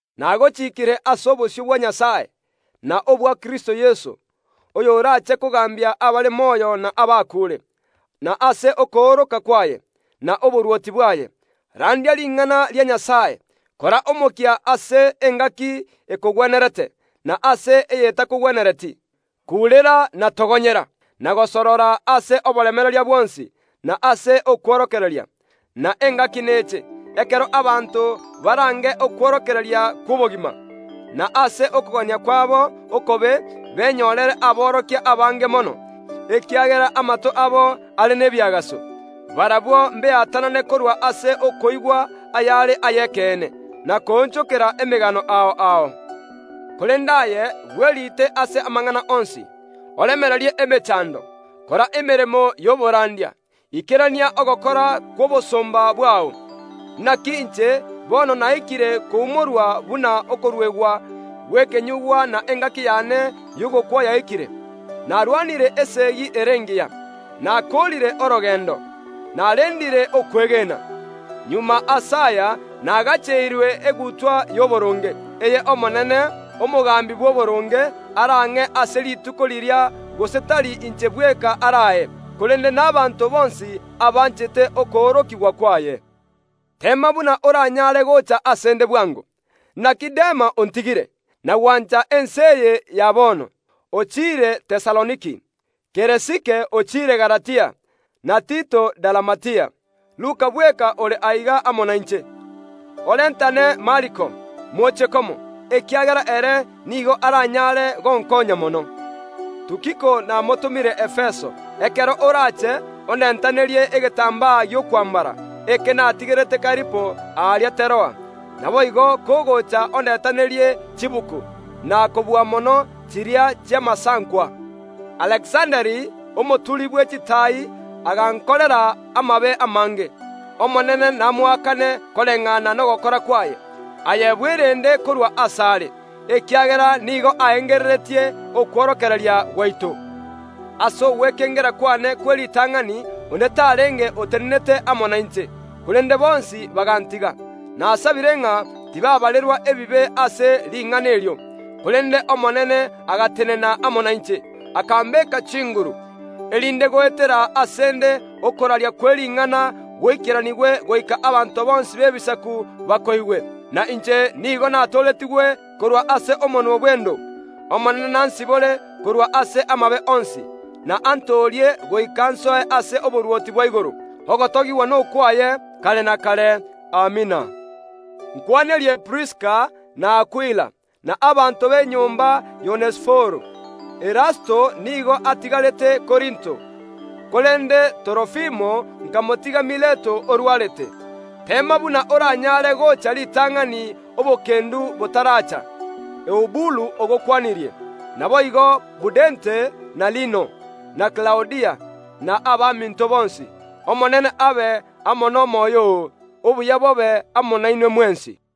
Nagochiikire ase obosio bwa Nyasae, na obwa Kristo Yeso, oyoraache kogaambia abare moyo na abakuure, na ase okooroka kwaye, na oborwoti bwaye. Randia Ring’ana ria Nyasae, kora omokia ase engaki ekogwenerete, na ase eyetakogwenereti, kuurera na togonyera, na gosorora ase oboremereria bwonsi, na ase okworokereria. Na engaki neche, ekero abanto barange okworokereria kw’obogima, na ase okogania kwabo okobe benyorere aborokia abange mono, ekiagera amato abo are nebiagaso. Barabwo mbeatanane korwa ase okoigwa ayare ay’ekeene, na koonchokera emegano ao ao. Korende aye, bweriite ase amang’ana onsi, oremererie emechando, kora emeremo y’oborandia, ikerania ogokora kw’obosomba bwao. Inaki inche bono naikire koumorwa buna okoruegwa gw’ekenyuugwa na engaki y’ane y’ogokwa yaikire. Narwanire esegi ere engiya, nakoorire orogeendo, narendire okwegena. Magega ase aya nagacheirwe egutwa y’oboronge, eye Omonene, omogambi bw’oboronge, arang’e ase Rituko riria gose tari inche bweka arae, korende nabaanto bonsi abanchete okoorokigwa kwaye. Teema buna oranyare gocha ase ’nde bwango. Inaki Dema ontigire, na gwancha ense eye ya bono; ochiire Tesaloniki. Keresike ochiire Galatia na Tito Dalamatia. Luka bweka ore aiga amo nainche. Orentane Mariko, moche komo, ekiagera ere nigo aranyare gonkoonya mono. Namotomire Tukiko Efeso. Ekero orache ondentanerie egetambaa gi’okwambara, eke natigerete Karipo aria Teroa. Naboigo kogocha ondentanerie chibuku, na kobua mono chiria chi’amasankwa. Alekisanda, omoturi bwe chitaai, agankorera amabe amange. Omonene namoakane koreng’ana nogokora kwaye. Aye bwerende korwa ase are, ekiagera nigo aengereretie okworokereria gwaito. Ase ogwekengera kw’ane kw’eritang’ani onde tarenge otenenete amo nainche, korende bonsi bagantiga. Nasabire ng’a tibaabarerwa ebibe ase ring’ana erio. Korende Omonene agatenena amo nainche, akambeeka chinguru, erinde goetera ase ’nde okoraria kwe ring’ana goikeranigwe goika abanto bonsi b’Ebisaku bakoigwe. Na inche nigo natooretigwe korwa ase omonwa bw’endo. Omonene nansibore korwa ase amabe onsi, na antoorie goika nsoe ase oborwoti bwa igoro. Ogotogigwa nokwaye kare na kare. Amina. Nkw’anerie Priska na Akwila, na abanto b’enyomba y’Onesiforo. Erasto nigo atigarete Korinto, korende Torofimo nkamotiga Mileto orwarete. Teema buna oranyaare gocha ritang’ani etoigo etaracha. Eubulu ogokwanirie, naboigo Pudente na Lino, na Klaudia, na abaminto bonsi. Omonene abe amo n’omoyo oo. Obuya bobe amo nainwe mwensi.